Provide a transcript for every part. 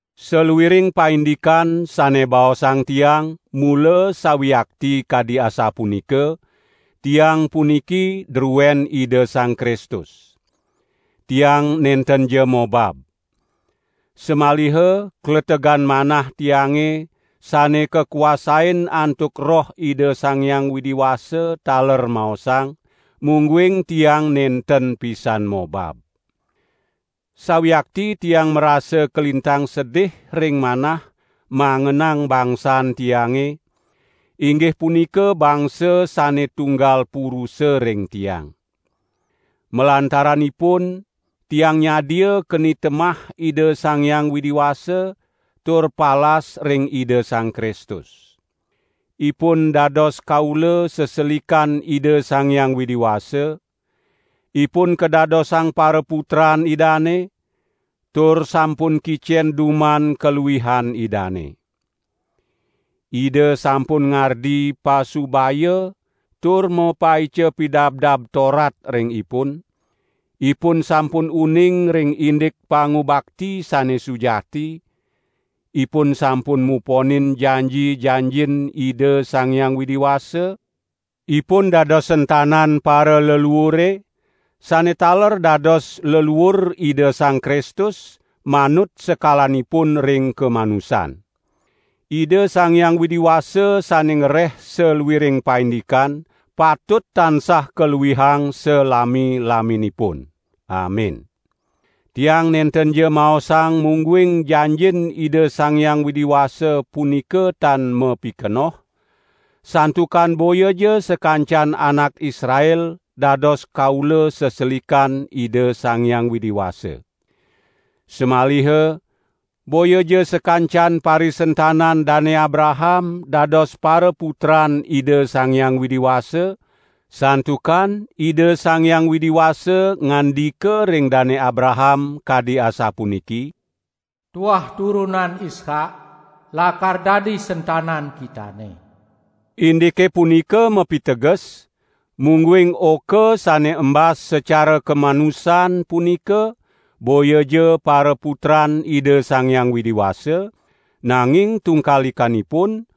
Saluiring paindikan sane baosang tiang mula sawiakti kadi asapunika; tiang puniki druen Ida Sang Kristus. Tiang nentenja mobab. Samaliha kletegan manah tiange sane kakuasain antuk Roh Ida Sang Hyang Widi Wasa taler maosang, mungguing tiang nenten pisan mobab. Sawiakti tiang marasa kalintang sedih ring manah mangenang bangsan tiange, inggih punika bangsa sane tunggal purusa ring tiang. Malantaran ipun, tiang nyadia keni temah Ida Sang Hyang Widi Wasa tur palas ring Ida Sang Kristus. Ipun dados kaula seselikan Ida Sang Hyang Widi Wasa; ipun kadadosang paraputran Idane, tur sampun kicen duman kaluihan Idane. Ida sampun ngardi pasubaya tur mapaica Pidabdab Torat ring ipun; ipun sampun uning ring indik pangubakti sane sujati; ipun sampun muponin janji-janjin Ida Sang Hyang Widi Wasa, ipun dados sentanan paraleluure, sane taler dados leluur Ida Sang Kristus manut sekalanipun ring kamanusan. Ida Sang Hyang Widi Wasa sane ngreh saluiring paindikan patut tansah kaluihang salami-laminipun. Amin. Tiang nentenja maosang mungguing janjin Ida Sang Hyang Widi Wasa punika tan mapikenoh; santukan boyaja sakancan anak Israel dados kaula seselikan Ida Sang Hyang Widi Wasa. Samaliha boyaja sakancan parisentanan Dane Abraham dados paraputran Ida Sang Hyang Widi Wasa; santukan Ida Sang Hyang Widi Wasa ngandika ring Dane Abraham kadi asapuniki: "Tuah turunan Ishak lakar dadi sentanan kitane." Indike punika mapiteges, mungguing oka sane embas sacara kamanusan punika boyaja paraputran Ida Sang Hyang Widi Wasa, nanging tungkalikanipun,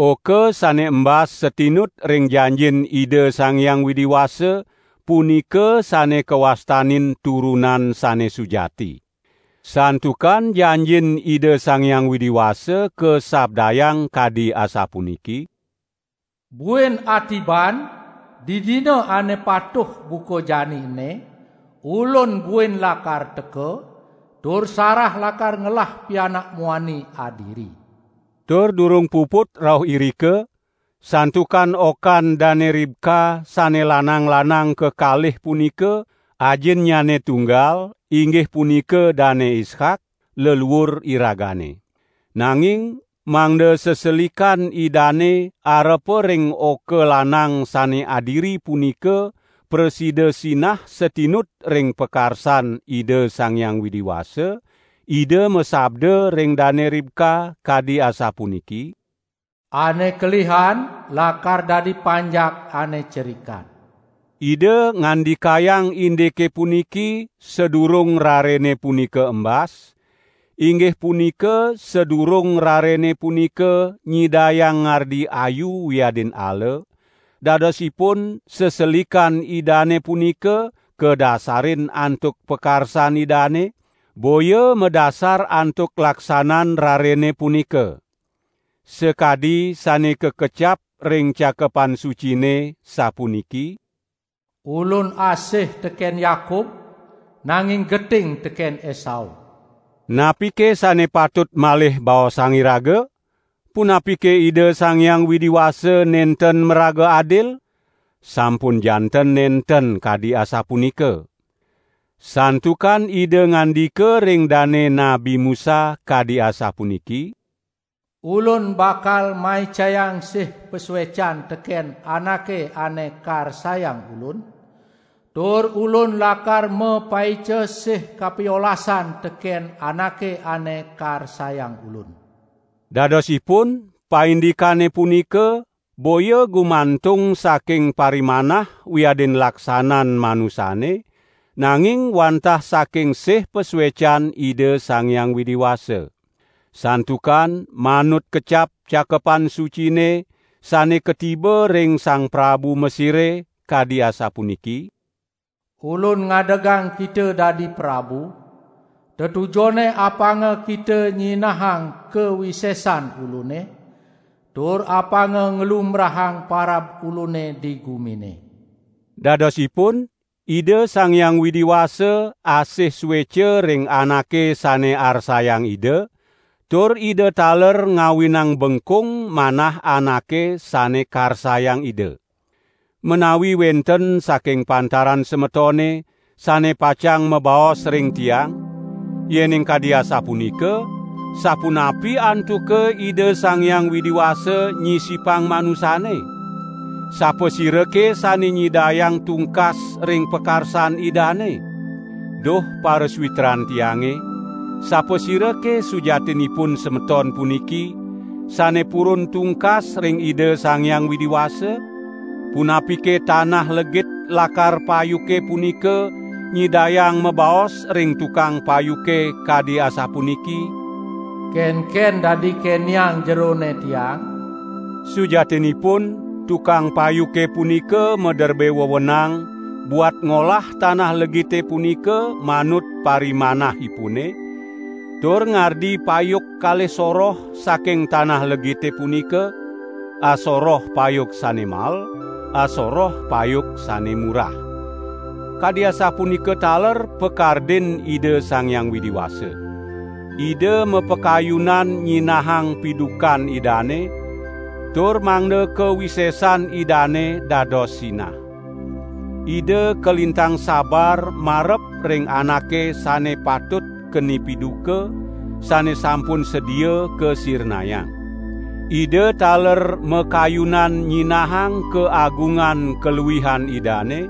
oka sane embas satinut ring janjin Ida Sang Hyang Widi Wasa punika sane kawastanin turunan sane sujati. Santukan janjin Ida Sang Hyang Widi Wasa kasabdayang kadi asapuniki: "Buin atiban, didina ane patuh buka jani ene, Ulun buin lakar teka, tur Sarah lakar ngelah pianak muani adiri." Tur durung puput rauh irika, santukan okan Dane Ribka sane lanang-lanang kekalih punika, ajinnyane tunggal, inggih punika Dane Ishak, leluur iragane. Nanging mangda seselikan Idane arepa ring oka lanang sane adiri punika prasida sinah satinut ring pakarsan Ida Sang Hyang Widi Wasa, Ida masabda ring Dane Ribka kadi asapuniki: "Ane kelihan lakar dadi panjak ane cerikan." Ida ngandikayang indike puniki sadurung rarene punika embas, inggih punika sadurung rarene punika nyidayang ngardi ayu wiadin ala; dadosipun seselikan Idane punika kadasarin antuk pakarsan Idane, boya madasar antuk laksanan rarene punika. Sakadi sane kakecap ring Cakepan Sucine, sapuniki: "Ulun asih teken Yakub, nanging geting teken Esau." Napike sane patut malih baosang iraga? Punapike Ida Sang Hyang Widi Wasa nenten maraga adil? Sampun janten nenten kadi asapunika! Santukan Ida ngandika ring dane Nabi Musa, kadi asapuniki: "Ulun bakal maicayang sih pasuecan teken anake ane karsayang Ulun tur Ulun lakar mapaica sih kapiolasan teken anake ane karsayang Ulun." Dadosipun paindikane punika boya gumantung saking parimanah wiadin laksanan manusane, nanging wantah saking sih pasuecan Ida Sang Hyang Widi Wasa. Santukan manut kecap Cakepan Sucine sane katiba ring sang prabu Mesire, kadi asapuniki: "Ulun ngadegang kita dadi prabu, tetujonne apanga kita nyinahang kawisesan Ulune, tur apanga nglumbrahang parab Ulune di gumine." Dadosipun Ida Sang Hyang Widi Wasa asih sueca ring anake sane arsayang Ida, tur Ida taler ngawinang bengkung manah anake sane karsayang Ida. Menawi wenten saking pantaran semetone sane pacang mabaos ring tiang: "Yening kadi asapunika, sapunapi antuka Ida Sang Hyang Widi Wasa nyisipang manusane? Sapasirake sane nyidayang tungkas ring pakarsan Idane?" Duh parasawitran tiange, sapasirake sujatinipun semeton puniki, sane purun tungkas ring Ida Sang Hyang Widi Wasa? Punapike tanah legit lakar payuke punika nyidayang mabaos ring tukang payuke kadi asapuniki: "Kenken dadi keneang jerone tiang?" Sujatinipun tukang payuke punika maderbe wewenang buat ngolah tanah legite punika manut parimanahipune, tur ngardi payuk kalih soroh saking tanah legite punika, asoroh payuk sane mael, asoroh payuk sane murah. Kadi asapunika taler pakardin Ida Sang Hyang Widi Wasa. Ida mapakayunan nyinahang pidukan Idane, tur mangda kawisesan Idane dados sinah. Ida kalintang sabar marep ring anake sane patut keni piduka, sane sampun sedia kasirnayang. Ida taler makayunan nyinahang kaagungan kaluihan Idane,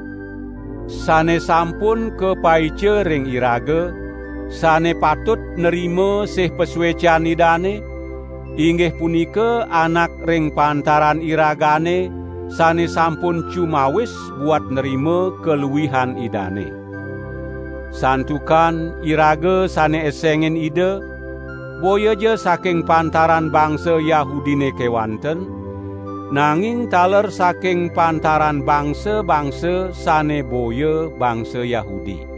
sane sampun kapaica ring iraga, sane patut nrima sih pasuecan Idane, inggih punika anak ring pantaran iragane sane sampun cumawis buat nrima kaluihan Idane. Santukan iraga sane esengin Ida, boyaja saking pantaran bangsa Yahudine kewanten, nanging taler saking pantaran bangsa-bangsa sane boya bangsa Yahudi.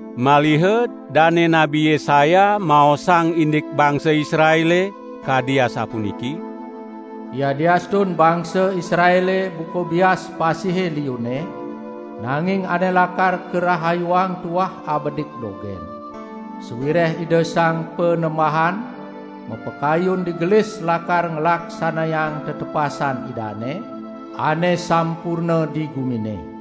Maliha dane Nabi Yesaya maosang indik bangsa Israele, kadi asapuniki: "Yadiastun bangsa Israele buka bias pasihe liunne, nanging ane lakar karahayuang tuah abedik dogen. Sawireh Ida Sang Panembahan mapakayun digelis lakar nglaksanayang tetepasan Idane ane sampurna di gumine."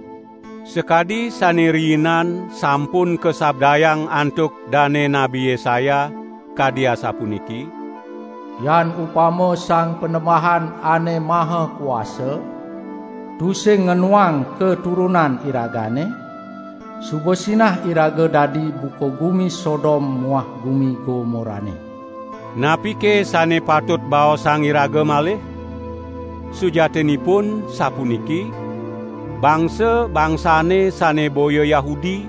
Sakadi sane riinan sampun kasabdayang antuk dane Nabi Yesaya, kadi asapuniki: "Yan upama Sang Panembahan Ane Maha Kuasa, tusing ngenuang katurunan iragane, suba sinah iraga dadi buka gumi Sodom muah gumi Gomorane." Napike sane patut baosang iraga malih? Sujatinipun sapuniki: Bangsa-bangsane sane boya Yahudi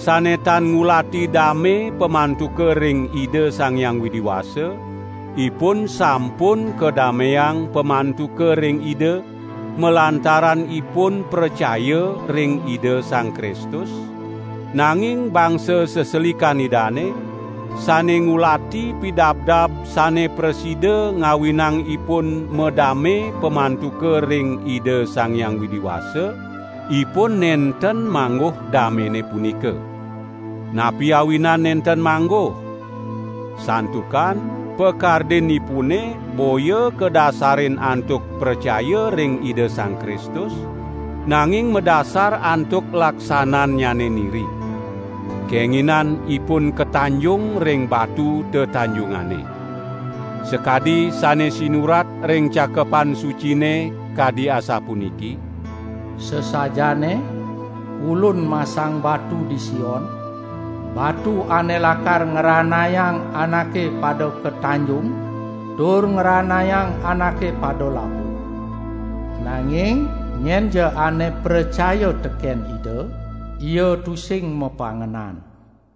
sane tan ngulati dame pamantuka ring Ida Sang Hyang Widi Wasa, ipun sampun kadameang pamantuka ring Ida, malantaran ipun pracaya ring Ida Sang Kristus; nanging bangsa seselikan Idane, sane ngulati pidabdab sane prasida ngawinang ipun madame pamantuka ring Ida Sang Hyang Widi Wasa, ipun nenten mangguh damene punika. Napi awinan nenten mangguh? Santukan pakardinipune boya kadasarin antuk pracaya ring Ida Sang Kristus, nanging madasar antuk laksanannyane niri. Kenginan ipun katanjung ring batu tetanjungane. Sakadi sane sinurat ring Cakepan Sucine kadi asapuniki: "Sasajaane, Ulun masang batu di Sion, batu ane lakar ngranayang anake pada katanjung, tur ngranayang anake pada labuh. Nanging nyenja ane pracaya teken Ida, ia tusing mapangenan."